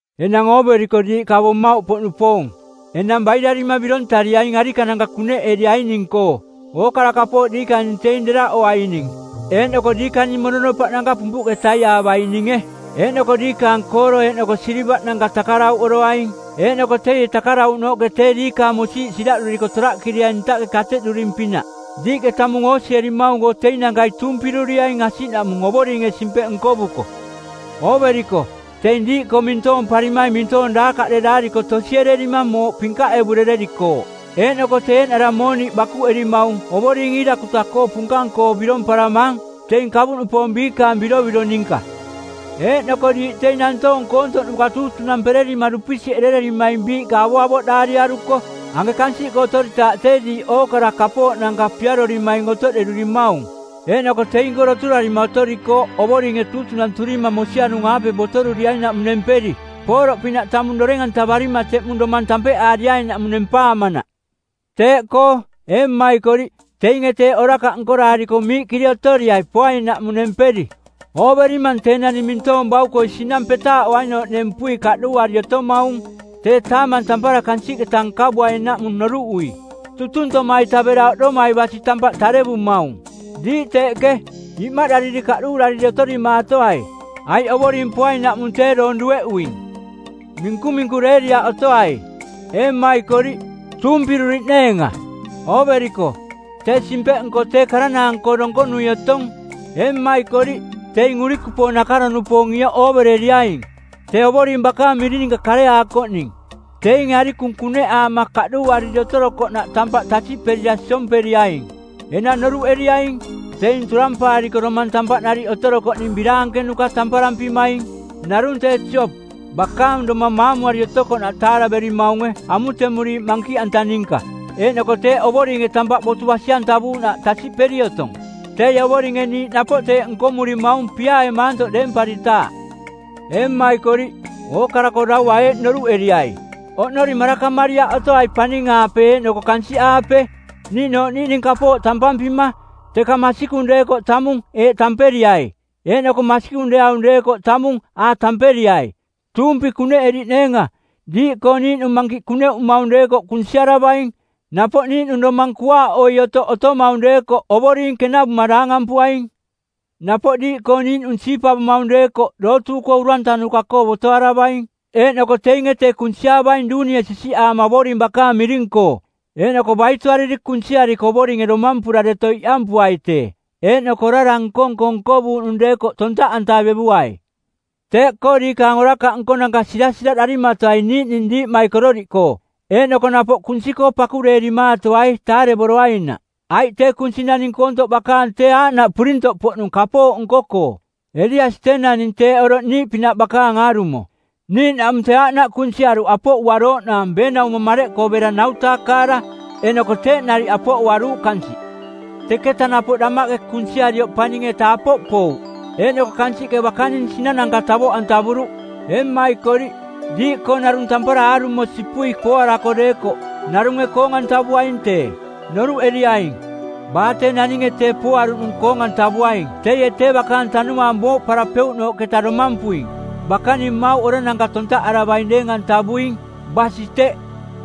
Enang ooveriko diiꞌ kavo mmauꞌpoꞌnupoong, enang bairarima birontariaing arikananka kuneꞌeriaining-koo. Ookara kapooꞌ diikaning teing deraꞌoroaining eeꞌnoko diikaning mononopaꞌnanka pumpuꞌke taiaavaininge. Eeꞌnoko diikaang kooro eeꞌnoko silivaꞌnanka takarauꞌoroaing, eeꞌnoko teie takarauꞌnooꞌke tee diikaang mosiiꞌ siraꞌduriko toraꞌkiriaing ntaꞌke kateꞌduring-pinaꞌ. Diiꞌke tamung oosierimaung-koo teinankai tuumpiruriaing asiꞌnaꞌmung Ovoringe simpeꞌ nkovuko. Ooveriko, teing diiꞌkoo mintoomparimaing mintoong daakaꞌderaariko tosiererima mooꞌ pinkaꞌevurererikooꞌ, eeꞌnoko tee eeꞌnara mooniꞌ bakuꞌerimaung Ovoring Iirakuta-koo punkang-koo biromparamang, teing kavuꞌnupoong biikaang birovirong ninka. Eeꞌnoko diiꞌ teing nantoong koontoꞌnuka tuutunampererima dupisiꞌerererimaing biiꞌka avoꞌavoꞌdaariaruko; Anke kansiꞌkoo otoritaaꞌ tee diiꞌ ookara kapooꞌnanka piarorimaing otoꞌderurimaung, eeꞌnoko teing-koo doturarima otorikooꞌ Ovoringe tuutunanturima mosianung-aape botoruriainaꞌmung nemperi, pooroꞌ pinaꞌ tamung doreng-antavarima teꞌmung domang tampeꞌaariainaꞌmung nempaamanaꞌ. Teeꞌkoo, ee mmaikoriꞌ, teinge teeꞌ orakaꞌ nkoraariko miiꞌkiri otoriai poainaꞌmung nemperi. Ooverimang tee naning mintoong bauko sinang petaaꞌoainooꞌ nempui kaꞌduuari otomaung tee taamang tampara kansiꞌketa nkavuainaꞌmung noruꞌui. Tutuntoma-ita bera oꞌdomai basi tampaꞌ tarevumaung. Diiꞌ teeꞌke, imaꞌdariri kaꞌduurariri otorimaatoai, aiꞌ Ovoring poainaꞌmung tee doong dueꞌuing. Minkuminkureeriaꞌ otoai, ee mmaikoriꞌ, tuumpiruriꞌneenga. Ooveriko, tee Simpeꞌnko˜ tee karanaang-koo donkonui otong. Ee mmaikoriꞌ, teing urikupoong nakaro-nupoong˜ ioꞌ oovereriaing, tee Ovoring bakaang miring ninka kareaakoꞌning. Teinge arikung kuneꞌaama kaꞌduuariri otorokoꞌnaꞌ tampaꞌ tasiꞌperira siomperiaing. Enang noruꞌereriaing, teing turampaariko domang tampaꞌ nariꞌ otorokoꞌning biraankenuka tamparampimaing. Narung tee Jop, bakaang domang maamuari otokoꞌnaꞌ taaraverimaunge amutemuriiꞌ mankiꞌanta ninka, eeꞌnoko teeꞌ Ovoringe tampaꞌ botu basi-antavuuꞌnaꞌ tasiꞌperi otong. Teie Ovoringe niiꞌ napoꞌ teeꞌ nkomurimaung piaae maantoꞌ deemparitaaꞌ. Ee mmaikoriꞌ, ookara-koo daua eeꞌ noruꞌeriai, oꞌnori marakamariaꞌ otoai paning-aape eeꞌnoko kansiꞌaape niiꞌnooꞌ niiꞌning kapooꞌ tampampima, teka masikung deekoꞌ tamung “eeꞌ” tamperiai, eeꞌnoko masikung deeaung deekoꞌ tamung “a” tamperiai, tuumpi kuneꞌeriꞌneenga. Diiꞌkoo niiꞌnung mankiꞌ kuneꞌumaung deekoꞌ kunsiaravaing. Napoꞌ niiꞌnung domang kuaaꞌoi otoꞌ otomaung deekoꞌ Ovoring kenavuma daangampuaing. Napoꞌ diiꞌkoo niiꞌnung siipavomaung deekoꞌ dootuuꞌkoo urantanuka-koo botoaravaing, eeꞌnoko teinge tee kunsiaavaing duunie sisiꞌaama Ovoring bakaang miring-koo. Eeꞌnoko baitoariri kunsiariko Ovoringe domampura deto iꞌampuai tee. Eeꞌnoko orara nko-nko nkovuuꞌnung deekoꞌ tontaꞌantavevuai. Teeꞌkoo diikaang orakaꞌ nkonanka sirasiraꞌdarimatoai niiꞌning diiꞌmaikororiꞌkoo. Eeꞌnoko napoꞌ kunsi-koo pakureerimaatoai taarevoroainaꞌ. Aiꞌ tee kunsi naning koontoꞌ bakaang tee aaꞌnaꞌ purintoꞌpoꞌnung kapooꞌ nko-koo. Eliasi tee naning teeꞌ oroꞌ niiꞌpinaꞌ bakaang aarumo, niiꞌnaꞌmung tee aaꞌnaꞌ kunsiaruꞌ apoꞌuarooꞌnaang beenaumo mareꞌkoo bera ˜nau-taa kaara, eeꞌnoko teeꞌ nariꞌ apoꞌuaruuꞌ kansiꞌ. Teketa napoꞌ damaꞌke kunsiarioꞌ paning-eta apoꞌ pouꞌ, eeꞌnoko kansiꞌke bakaning sinananka tavoꞌantavuruꞌ. Ee mmaikoriꞌ, diiꞌkoo narung tampara aarumo sipui pooarako deekoꞌ, narunge koong-antavuaing tee. Noruꞌeriaing, baa tee naninge tee pooaruꞌnung koong-antavuaing teie tee bakaang tanuaang booꞌparapeuꞌnooꞌketa domampuing. Bakaning mmauꞌ orananka tontaꞌaravaing deeng-antavuing. Basi teꞌ.